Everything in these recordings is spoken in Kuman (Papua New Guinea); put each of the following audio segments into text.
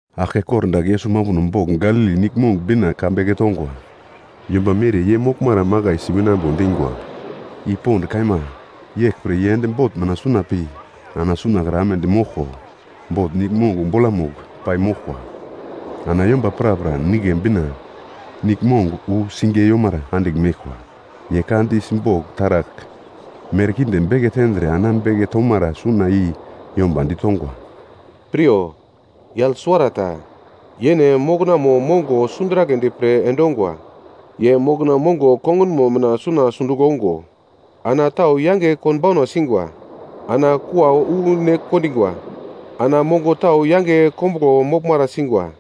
Aglke kordagl Yesus mambuno bogl Galili Niglmong bina ka beke tongwa. Yomba mere ye moglmara makaisi winambo dingwa. I pond kaima, yeglpre ye ende bot mina suna pi ana suna kra amedi moglko, bot niglmong bolamugl pai moglkwa. Ana yomba prapra nigle bina niglmong wu sing yomara andigl meglkwa. Ye ka di simbogl taragl merkinde beke tendre ana beke tomara suna i yomba ditongwa, “Piryo, yagl suwarata, yene moknamo mongo sunduraglendi pre endongwa. Ye mokna mongo kongunmo mina suna sundugl ongo ana tau yange konbauna singwa, ana kua wu ne kondingwa. Ana mongo tau yange kombuglo moglmara singwa,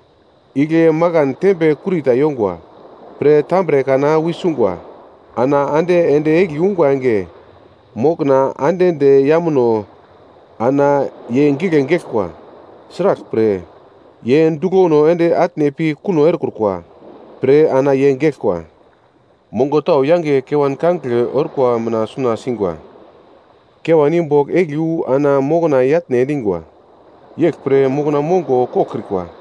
igle makan tembe kurita yongwa pre tambre kana wisungwa. Ana ande ende egli ungwa enge, mokna ande de yamuno ana ye gigle geglkwa, sraglpre ye duglono ende atne pi kuno erekrukwa pre ana ye geglkwa. Mongo tau yange kewan kangigle orkwa mina suna singwa. Kewan i bogl egli wu ana mokna yatne endingwa, yeglpre mokna mongo koglkrikwa.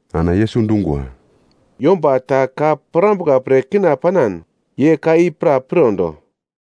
Ana Yesus dungwa, “Yomba ta ka pirambuka pre kina panan, ye ka i pra pirondo!”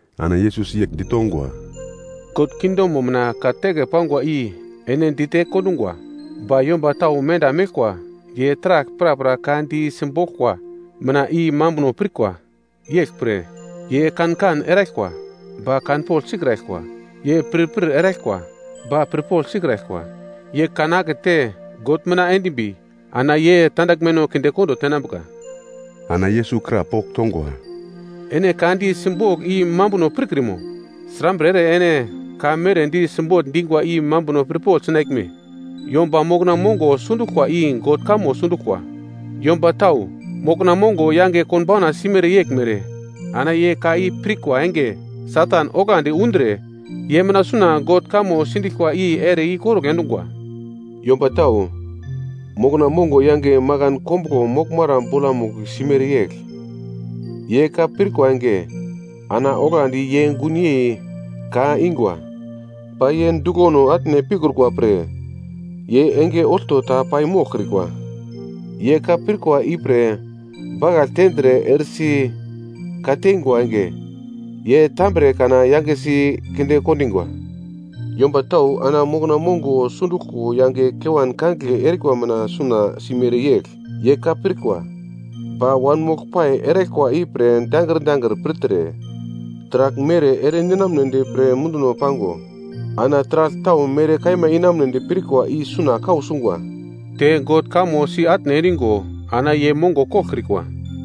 Ana Yesus yegl ditongwa, “God kingdomo mina ka teke pangwa i ene dite kondungwa. Ba yomba tau menda meglkwa, ye taragl prapra ka di simboglka mina i mambuno pirkwa. Yeglpre, “‘Ye kan-kan eraglkwa, ba kanpogl sikraglkwa. Ye pirpir eraglkwa, ba pirpogl sikraglkwa. Ye kan-akete God mina endimbi, ana ye tandaglmeno kindekondo tenambuka!’” Ana Yesus krapogl tongwa, “Ene ka di simbogl i mambuno pirkrimo? Srambre ere ene ka mere di simbogl dingwa i mambuno pirpogl sinaglme? Yomba mokna mongo sunduglkwa i God kamo sunduglkwa. Yomba tau, mokna mongo yange konbauna simere yeglmere ana ye ka i pirkwa enge Satan oglandi undre ye mina suna God kamo sindiglkwa i ere ikorugl endungwa. Yomba tau, mokna mongo yange makan kombuglo moglmara bolamugl simere yegl. Ye ka pirkwa enge, ana oglandi ye gunyei ka ingwa. Ba ye duglono atne pikrukwa pre, ye enge olto ta pai moglkrikwa. Ye ka pirkwa ipre bakagl tendre eresi ka-teingwa enge, ye tambre-kana yangesi kinde kondingwa. Yomba tau ana mokna mongo sunduglko yange kewan kangigle erikwa mina suna simere yegl. Ye ka pirkwa, ba wanmoglpai eraglkwa ipre dangir dangir pirtre, taragl mere ere ninamnedi pre munduno pango, ana taragl tau mere kaima inamunedi pirkwa i suna kau sungwa, te God kamo si-atne endingo ana ye mongo koglkrikwa.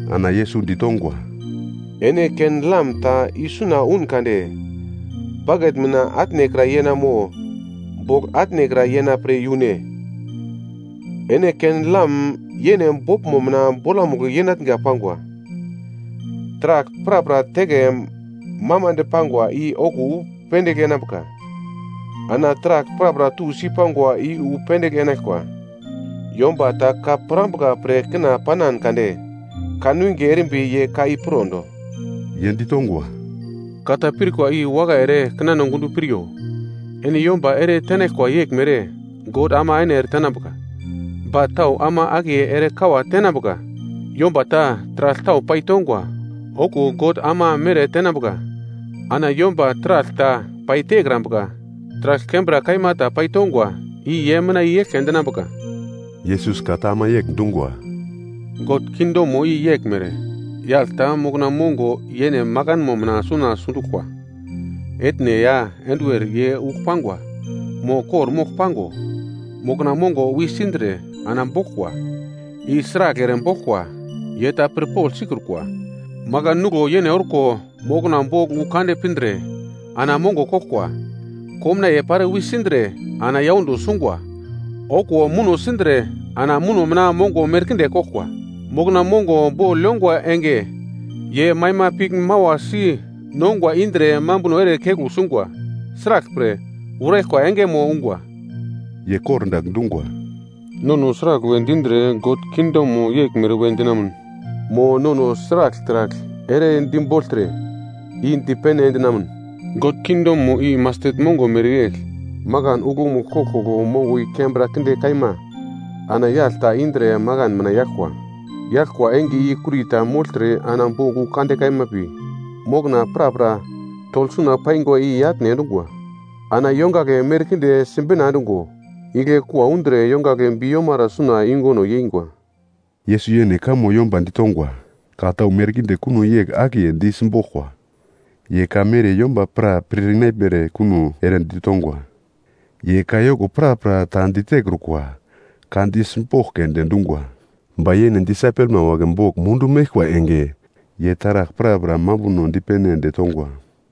Ana Yesus ditongwa, “Ene ken-lam ta isuna un kade, baket mina atnekra yena mo bogl atnekra yena pre yune? Ene ken-lam yene boglmo mina bolamugl yenatnga pangwa. Taragl prapra teke mamande pangwa i okuwo wu pendigl enambuka. Ana taragl prapra tusi pangwa i wu pendigl enaglkwa. Yomba ta ka pirambuka pre kina panan kade, kanwinge erimbi ye ka i pirondo.” Ye ditongwa, “Ka ta pirkwa i wakai ere kinano gundo piryo. Ene yomba ere tenaglkwa yeglmere God ama ene ere tenambuka, ba tau ama akiye ere kawate tenambuka. Yomba ta taragl tau paitongwa, okuwo God ama mere tenambuka. Ana yomba taragl ta paitekrambuka, taragl kembra kaima ta paitongwa, i ye mina i eglke endinambuka.” Yesus ka ta ama yegl dungwa, “God kingdomo i yeglmere. Yagl ta mokna mongo yene makanmo mina suna sunduglkwa. Etne ya enduwer ye ugl pangwa, mo kor-mogl pango, mokna mongo wisindre ana boglkwa. I sragl ere boglkwa, ye ta pirpogl sikrukwa. Makan nuglo yene orko mokna bogl wu kande pindre ana mongo koglkwa. Komnaiye pare wisindre ana yaundo sungwa, okuwo muno sindre ana muno mina mongo merkinde koglkwa. Mokna mongo bogl yongwa enge, ye maima pigl mawasi nongwa indre mambuno ere keglu sungwa, sraglpre, uraglkwa engemo ungwa.” Ye kordagl dungwa, “Nono sragl we dindre God kingdomo yeglmere we dinamun? Mo nono sragl taragl ere dibogltre, i dipene endinamun? God kingdomo i mastet mongo mereyegl, makan uglomugl koglkoglo mongo i kembra kinde kaima ana yagl ta indre makan mina yaglkwa. Yaglkwa enge i kurita mogltre ana bogl wu kande kaima pi mokna prapra togl suna paingwa i-yatne endungwa. Ana yongagle merkinde sibina endungo, igle kua undre yongagle bi-yomara suna yunguno yeingwa.” Yesus yene kamo yomba ditongwa. Ka tau merkinde kuno yegl akiye di simboglkwa. Ye ka mere yomba pra pir inaglmere kuno ere ditongwa. Ye kayoko prapra ta ditekrukwa, ka di simbogl keunde dungwa. Ba yene disaipelma wagle bogl mundu meglkwa enge, ye taragl prapra mambuno dipene ende tongwa.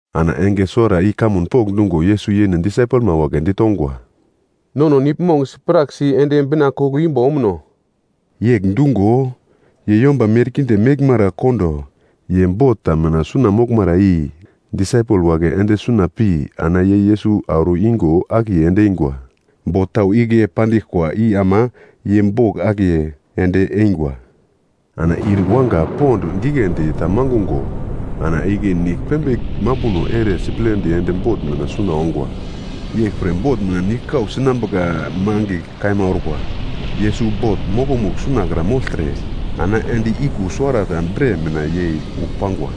Ana enge suwara i kamun pokndungo Yesus yene disaipelma wagle ditongwa, “Nono niglmong sipraksi ende bina koglo imbo omuno.” Yegl dungo, ye yomba merkinde meglmara kondo, ye bot ta mina suna moglmara i disaipel wagle ende suna pi ana ye Yesus auro ingo akiye endeingwa. Bot tau igle pandiglkwa i ama ye bogl akiye ende eingwa. Ana ir yuwanga pond giglendi ta mangungo ana igle nigl pembigl mambuno ere siplendi ende bot mina suna ongwa. Yeglpre bot mina nigl kau sinambuka mangigl kaima orkwa. Yesus bot mokomugl suna kra mogltre ana endi iku suwarata bre mina yei ugl pangwa.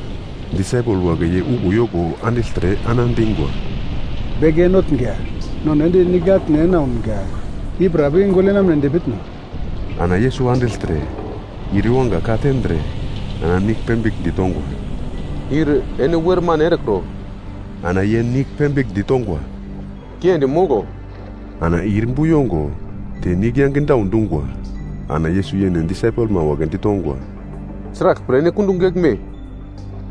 Disaipel wagle ye uglo yoko andigltre ana dingwa, “Beke Notnga, nono ende nigl atne ena ounga, i pra pi gogl yenamnedi pitno?” Ana Yesus andigltre ir yuwanga ka tendre ana nigl pembigl ditongwa. “Ir ene wermane erekro.” Ana ye nigl pembigl ditongwa, “Kiendi moglo!” Ana ir bu yongo te nigl yange daudungwa. Ana Yesus yene disaipelma wagle ditongwa, “Sraglpre ene kundugl geglme?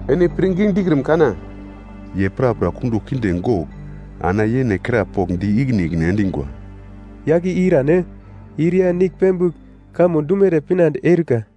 Ene pirngi dikrim kana?” Ye prapra kundugl kinde gogl ana yene krapogl di ikine ikine endingwa, “Yagl i irane? Ir ya nigl pembigl kamo dumere pinande eurika.”